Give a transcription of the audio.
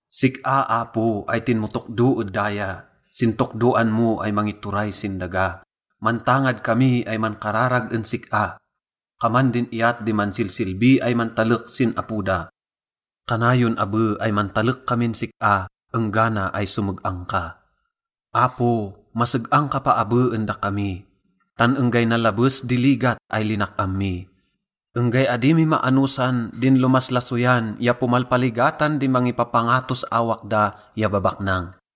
Sik-a, Apo, ay tinmotokdo ed daya sin tokdoan mo ay mangituray sin daga, mantangad kami ay mankararag en sik-a. Kaman din iyat di mansilsilbi ay mantalek sin apo da, kanayon abe ay mantalek kamin sik-a enggana ay someg-ang ka. Apo, maseg-ang ka paabe en dakami, tan enggay nalabes di ligat ay linak-am mi. Enggay adi mi maanosan din lomaslasoyan ya pomalpaligatan di mangipapangatos awak da ya babaknang.